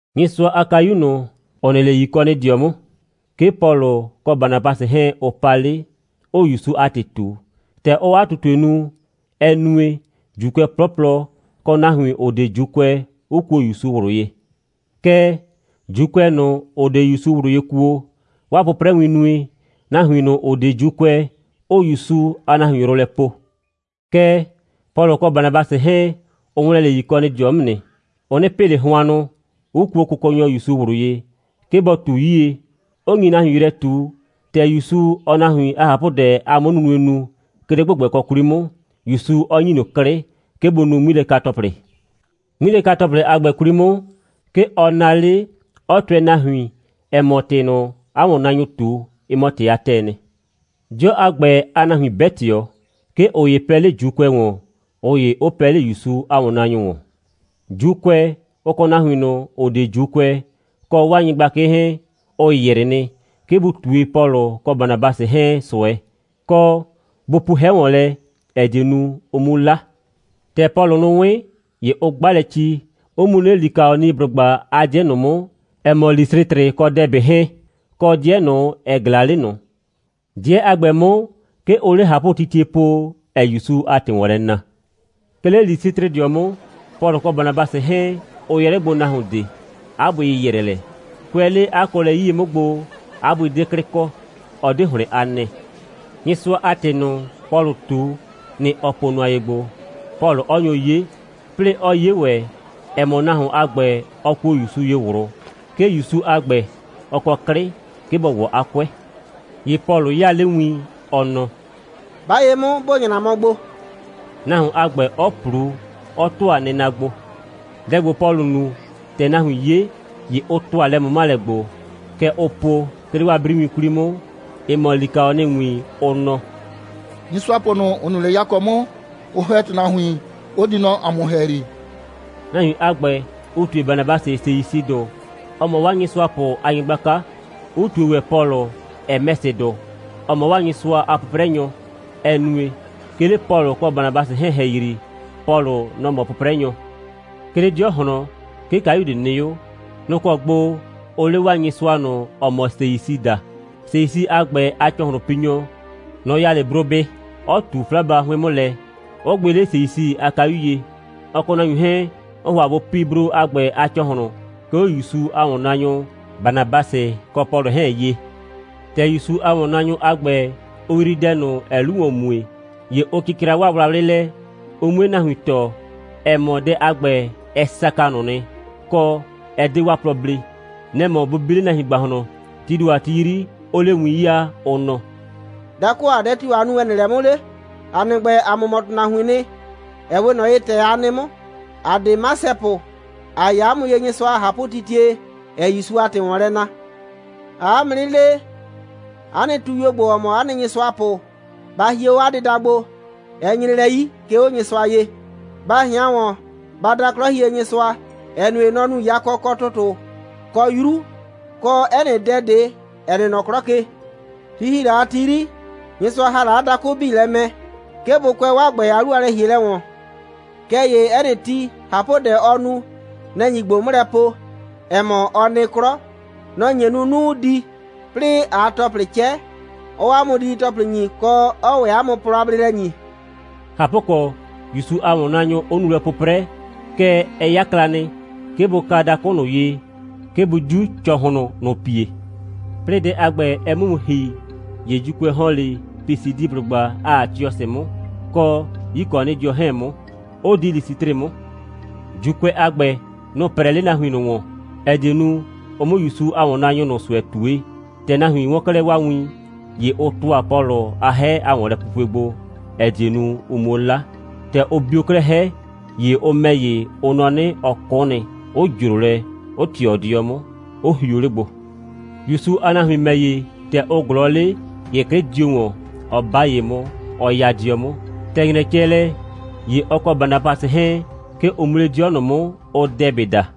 Nyɩsʋa a kayu ꞊nʋ, ‑ʋ nɩ 'le Yikɔnɩdɩɔ 'mʋ, 'ke Pɔlʋ kɔ Banabasɩ 'hɛɛn, ʋ pa 'le, 'ʋʋ ‑Yusu a ‑tɩ ꞊tu. ‑Tɛ ʋʋ 'a ꞊tutue nu, ɛ nue, ‑Juukʋɛ 'plɔplɔ, kɔ nahuin, ‑ʋ 'de ‑Juukʋɛ, 'ʋ kuo ‑Yusu ꞊wlʋ ye. Kɛɛ, ‑Juukʋɛ ꞊nʋ, ‑ʋ 'de ‑Yusu ꞊wlʋ ye kuo, 'waa 'pʋprɛwin nue, nahuin ꞊nʋ, ‑ʋ 'de ‑Juukʋɛ, 'ʋʋ ‑Yusu a nahuin yrʋ lɛ poo. Kɛɛ, Pɔlʋ kɔ Banabasɩ 'hɛɛn, ʋ ‑wlɛn 'le Yikɔnɩdɩɔ 'mʋ nɩ. Ʋ 'nɩ pɩ ꞊le hʋannʋ, 'ʋ kuo Kʋkɔnyɔ ‑Yusu ꞊wlʋ ye, 'ke bɔ ꞊tu 'yie, 'ʋ nyi nahuin yrɛ ꞊tu, ‑tɛ ‑Yusu, ɔɔ nahuin a ꞊hapʋdɛ a 'mʋnunue nu, 'ke 'le ‑gbʋgbɛkɔ 'kwli 'mʋ, ‑Yusu 'ɔ ‑nyi ꞊nʋ 'klɩ, 'ke bʋ nu 'ŋmilɛka‑tɔplɩ. 'Ŋmilɛka‑tɔplɩ a ‑gbɛ 'kwli 'mʋ, 'ke ɔ naa 'le, 'ɔ tʋɛ nahuin, ‑ɛ mɔ, ‑tɩ ꞊nʋ, 'a ‑wɔnnaanyʋʋ ꞊tu, ɩ mɔ ‑tɩ a ‑tɛɛ nɩ. 'Dɩɔ a ‑gbɛ a nahuin 'bɛ ꞊tɩɔ. 'Ke ꞊ʋ ‑ye pɛɛ 'le ‑Juukʋɛ ‑wɔn, ꞊ʋ ‑ye 'ʋ pɛɛ 'le ‑Yusu a ‑wɔnnaanyʋ ‑wɔn. ‑Juukʋɛ, ʋ kɔ nahuin ꞊nʋ, ‑ʋ 'de ‑Juukʋɛ, kɔ 'waa nyɩgblakɩ 'hɛɛn, ʋ ‑yrɩ nɩ, 'ke bʋ ꞊tue Pɔlʋ kɔ Banabasɩ 'hɛɛn ꞊sʋɛ, kɔ, bʋ pu 'hɛ ‑wɔn lɛ, ‑ɛ die nu, ʋ 'mu 'la. ‑Tɛ Pɔlʋ nʋ 'wɩn, ‑ye ʋ 'gba lɛ ci, 'ʋ mu 'le Likaɔniblʋgba a 'dɩɛ ꞊nʋ 'mʋ, ‑ɛ mɔ Lisɩtrɩ kɔ Dɛbɩ 'hɛɛn, kɔ 'dɩɛ ꞊nʋ, ‑ɛ ꞊glaa 'le ꞊nʋ. 'Dɩɛ a ‑gbɛ 'mʋ, 'ke ʋʋ 'le ꞊hapʋtitie po, ‑ɛɛ ‑Yusu a ‑tɩ ‑wɔn lɛ na. 'Ke 'le Lisɩtrɩdɩɔ 'mʋ, Pɔlʋ kɔ Banabasɩ 'hɛɛn, ʋ yɛ 'le gbo nahuon ꞊de. 'A bʋɩ ‑yɩyrɛ lɛ. Kʋɛ 'le 'a kɔɔlɛ 'yie 'mʋ gbo, 'a bʋɩ 'de 'klɩ kɔ. Ɔ 'de ‑hlɩn a nɛɛ. Nyɩsʋa a ‑tɩ ꞊nʋ, Pɔlʋʋ ꞊tu, nɩ‑ ɔ po nʋa ye gbo, Pɔlʋ 'ɔ nyo 'ye, 'plɩɩ 'ɔ 'ye ‑wɛ, ‑ɛ mɔ, nahuon a ‑gbɛ, ɔ kuo ‑Yusu ye ꞊wlʋ, 'ke ‑Yusu a ‑gbɛ, ɔ kɔ 'klɩ, 'ke bɔ ‑wɔ 'a 'kʋɛ. ‑Ye Pɔlʋ 'yaa 'le win, ɔ nɔ: «'Ba ye 'mʋ, ‑bo nyra gbo!» nahuon a ‑gbɛ 'ɔ ꞊plu, 'ɔ ‑tʋa nɩna gbo. Dɛ ‑gbo, Pɔlʋ nu, ‑tɛ nahuin 'ye, ‑ye ʋ ‑tʋa lɛ꞊mʋmalɛ gbo, kɛ ʋʋ po, 'ke 'le 'waa 'briwin 'kwli 'mʋ, ‑ɩ mɔ likaɔniwin, ʋ nɔ: «Nyɩsʋapʋ ꞊nʋ, ‑ʋ nɩ 'le yakɔ 'mʋ, ʋ ‑hɛ ‑tʋnahuin, 'ʋ di nɔ ‑a mʋ ‑hɛyri,» nahuin a ‑gbɛ 'ʋ ꞊tue Banabasɩ Seisɩdʋ, ‑ɔ mɔ 'waa nyɩsʋapʋ a nyɩgblaka, 'ʋ ꞊tue ‑wɛ Pɔlʋ Hɛmɛsɩdʋ, ‑ɔ mɔ 'waa nyɩsʋapʋ a 'pʋprɛnyɔ, ‑ɛ nue, 'ke 'le Pɔlʋ kɔ Banabasɩ 'hɛɛn ‑hɛyri, Pɔlʋ, nɔ‑ mɔ 'pʋprɛnyɔ. 'Ke 'le 'dɩɔ ꞊hlɔn, 'ke kayu ꞊de nɩ 'o. Nʋ‑ kɔ gbo ʋʋ 'le 'waa nyɩsʋa ꞊nʋ, ‑ɔ mɔ Seisɩ daa. Seisɩ a ‑gbɛ a ‑cɔhlʋnpinyɔ, nɔ‑ ya 'le brobɩ, ɔ ꞊tu 'flaba 'hʋɩn 'mʋ lɛ, 'ʋ gbɩ 'le Seisɩ a kayu ye. Ɔ kɔ nahuin 'hɛɛn, ʋʋ ‑hʋa bʋ pi bro a ‑gbɛ a ‑cɔhlʋn, 'ke 'o ‑Yusu a ‑wɔnnaanyʋ Banabasɩ kɔ Pɔlʋ 'hɛɛn ye. ‑Tɛ ‑Yusu a ‑wɔnnaanyʋ a ‑gbɛ, ʋ yrii dɛ ꞊nʋ, ‑ɛɛ 'lu ‑wɔn mue, ‑ye ʋ cɩcra 'waa wlawlɩ lɛ, ʋ 'mue nahuin tɔɔ, ‑ɛ mɔ, dɛ a ‑gbɛ, ɛ saka ꞊nʋ nɩ, kɔ, 'ɛ 'de 'waa plɔ blee. Nɛ‑ mɔ bʋ bi 'le nahuin ‑gbahlɔn, tii ‑do a ti 'yri, 'ʋʋ 'le win 'yaa, ʋ nɔ: «Dakʋ ‑a, dɛ tio‑ aa nu, ‑ɛ nɩ lɛ 'mʋ 'le? ‑A nɩ ‑gbɛ, ‑a mʋ mɔ ‑tʋnahuiin nɩ, ‑ɛ 'we ꞊nɔ ye, ‑tɛ a nɩ 'mʋ. ‑A 'de nyɩsʋapʋ. ‑A ya 'a mʋ ye Nyɩsʋa a ꞊hapʋtitie, ‑ɛɛ ‑Yusu a ‑tɩ ‑wɔn lɛ na. ‑Aa 'a mʋ 'nɩ le, 'a nɩ tuyuo ‑gbo, ‑ɔ mɔ 'a nɩ nyɩsʋapʋ, ba hie 'o 'a dɩda gbo. Ɛ nyre lɛ 'yi, 'ke 'o Nyɩsʋa ye. Ba ꞊hɩan ‑wɔn, ba da 'Klɔhienyɩsʋa, ‑ɛ nue, nɔ‑ nu yakɔ, kɔ ‑tʋtʋ, kɔ 'yru, kɔ 'ɛ nɩ dɛ ꞊de, ‑ɛ nɩ nɔ 'klɔ ke. Ti ‑hi la a ti 'yri, Nyɩsʋa ‑ha la dakʋ 'bii lɛ mɛ, 'ke bʋ kʋɛ 'waa ‑gbɛ a 'lu a lɛ‑hielɛ ‑wɔn. Kɛɛ ‑ye 'ɛ nɩ ti, ꞊hapʋdɛ, ɔɔ nu, nɛ‑ nyi ꞊gbo 'mʋ lɛ po, ‑ɛ mɔ, ɔ nɩ 'klɔ. Nɔ‑ nye nu, 'nu 'ʋʋ di, 'plɩɩ ꞊aa ‑tɔplɩ 'cɛ, 'ɔɔ ‑a mʋ didi‑tɔplɩ ‑nyi, kɔ, 'ɔɔ ‑wɛ 'a mʋ plɔ a bleelɛ ‑nyi.» ꞊Hapʋkɔ, ‑Yusu a ‑wɔnnaanyʋ 'ʋ nu lɛ 'pʋprɛ, kɛɛ, ɛ 'yakla nɩ, 'ke bʋ ka dakʋ ꞊nʋ ye, 'ke bʋ 'diu ‑cɔhlʋn ꞊nʋ pie. 'Plɩɩ dɛ a ‑gbɛ, ɛ 'mʋ mu ‑hi, ‑ye ‑Juukʋɛ ‑hɔn 'le Pisidiblʋgba a Atiɔsɩdɩɔ 'mʋ, kɔ Yikɔnɩdɩɔ 'hɛɛn 'mʋ, 'ʋ di Lisɩtrɩ 'mʋ. ‑Juukʋɛ a ‑gbɛ, nʋ‑ 'prɛɛ 'le nahuin ꞊nʋ ‑wɔn, ‑ɛ die nu, ʋ 'mʋ ‑Yusu a ‑wɔnnaanyʋ ꞊nʋ ꞊sʋɛ ꞊tue. ‑Tɛ nahuin 'wɔn 'klɛɛ 'waa win, ‑ye ʋ ‑tʋa Pɔlʋ a 'hɛ a ‑wɔnlɛpupue gbo, ‑ɛ die nu, ʋ 'muo 'la. ‑Tɛ ʋ bio 'klɛɛ 'hɛ, ‑ye ʋ ‑mɛ ‑ye, ʋ nɔ 'nɩ, ɔ 'kʋ nɩ, 'ʋ ‑jro lɛ, 'ʋ ꞊tɩɔ 'dɩɔ 'mʋ, 'ʋ hio 'le gbo. ‑Yusu a nahuin ‑mɛ ‑ye, ‑tɛ ʋ ꞊glɔɔ 'le, ‑ye 'klɩ dio ‑wɔn, 'ɔ 'ba ye 'mʋ, 'ɔ 'ya 'dɩɔ 'mʋ. ‑Tɛ ‑nyrɛ cɛ lɛ, ‑ye ɔ kɔ Banabasɩ 'hɛɛn, 'ke ʋ mu 'le 'dɩɔ ꞊nʋ 'mʋ, ʋʋ Dɛbɩ daa.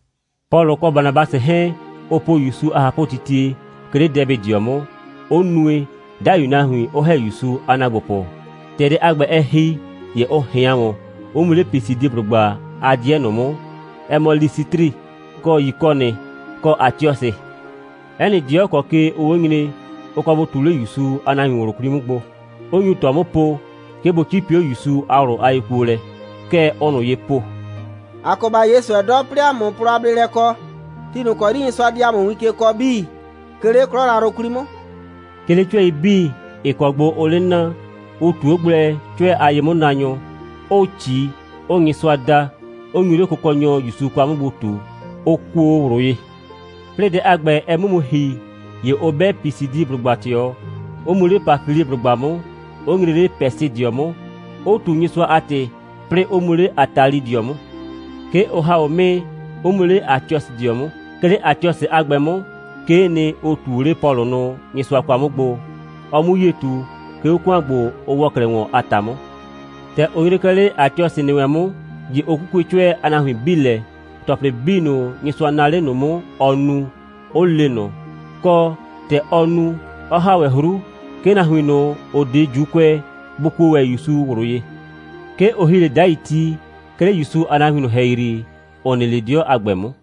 Pɔlʋ kɔ Banabasɩ 'hɛɛn, ʋ po ‑Yusu a ꞊hapʋtitie, 'ke 'le Dɛbɩdɩɔ 'mʋ, 'ʋ nue, 'dai nahuin 'ʋ ‑hɛ ‑Yusu a ‑naagbopʋ. ‑Tɛ dɛ a ‑gbɛ, ɛ ‑hi, ‑ye ʋ ꞊hɩan ‑wɔn, 'ʋ mu 'le Pisidiblʋgba a 'dɩɛ ꞊nʋ 'mʋ, ‑ɛ mɔ Lisɩtrɩ, kɔ Yikɔnɩ, kɔ Atiɔsɩ. 'Ɛ nɩ 'dɩɔ ‑kɔ ke ʋʋ 'o nyre, ʋ kɔ bʋ ꞊tu 'le ‑Yusu a nahuin ꞊wlʋ 'kwli 'mʋ gbo, 'ʋ nyu ꞊tɔ 'mʋ po, 'ke bʋ 'cipi 'o ‑Yusu a ꞊wlʋ a yekuolɛ. Kɛ ʋʋ ꞊nʋ ye po: «‑A kɔ ‑ba 'ye ꞊sʋɛ 'dɔ, 'plɩɩ ‑a 'mʋ plɔ a bleelɛ kɔ, ti ‑kɔ 'yri Nyɩsʋa di ‑a mʋ win ke kɔɔ 'bii, 'ke 'le 'klɔ yrayrʋ 'kwli 'mʋ.» 'Ke 'le 'cʋɛi 'bii, ‑ɩ kɔ gbo ʋʋ 'le na, ʋ ꞊tu 'o gblɛ 'cʋɛ a ye'mʋnaanyʋ, 'ʋʋ ꞊ci, 'ʋʋ Nyɩsʋa da, 'ʋ nyu 'le Kʋkɔnyɔ ‑Yusu kwa 'mʋ gbo ꞊tu, ʋ kuo o ꞊wlʋ ye. 'Plɩɩ dɛ a ‑gbɛ, ɛ 'mʋ mu ‑hi, ‑ye ʋ 'bɛ Pisidiblʋgba ꞊tɩɔ, 'ʋ mu 'le Pafiliblʋgba 'mʋ, 'ʋ nyre 'le Pɛsɩdɩɔ 'mʋ, 'ʋ ꞊tu Nyɩsʋa a ‑tɩ, 'plɩɩ 'ʋ mu 'le Atalidɩɔ 'mʋ. 'Ke ʋ ‑ha 'o 'mɩɩ, 'ʋ mu 'le Atiɔsɩdɩɔ 'mʋ. 'Ke 'le Atiɔsɩ a ‑gbɛ 'mʋ, 'kee nɩ, ʋ ꞊tu o 'le Pɔlʋ nʋ Nyɩsʋa kwa 'mʋ gbo, ɔ 'mu 'yie ꞊tu, 'ke 'o ‑kʋan ‑gbo, ʋ ‑wɔ 'klɛɛ ‑wɔn a ‑ta 'mʋ. ‑Tɛ ʋ nyre 'klɛɛ 'le Atiɔsɩdɩɔ ‑nɩ wɛn 'mʋ, ‑ye ʋ 'kukue 'cʋɛ a nahuin 'bii lɛ, ‑tɔplɩ 'bii ꞊nʋ, Nyɩsʋa naa 'le ꞊nʋ 'mʋ, ɔ nu, 'ʋ le ꞊nʋ, kɔ, ‑tɛ ɔ nu, 'ɔ ‑ha ‑wɛ 'hru, 'ke nahuin ꞊nʋ, ‑ʋ 'de ‑Juukʋɛ, bʋ kuo ‑wɛ ‑Yusu ꞊wlʋ ye. 'Ke ʋ ‑hi 'le 'dai ti, 'ke 'le ‑Yusu a nahuin ꞊nʋ ‑hɛyri, ‑ʋ nɩ 'le 'dɩɔ a ‑gbɛ 'mʋ.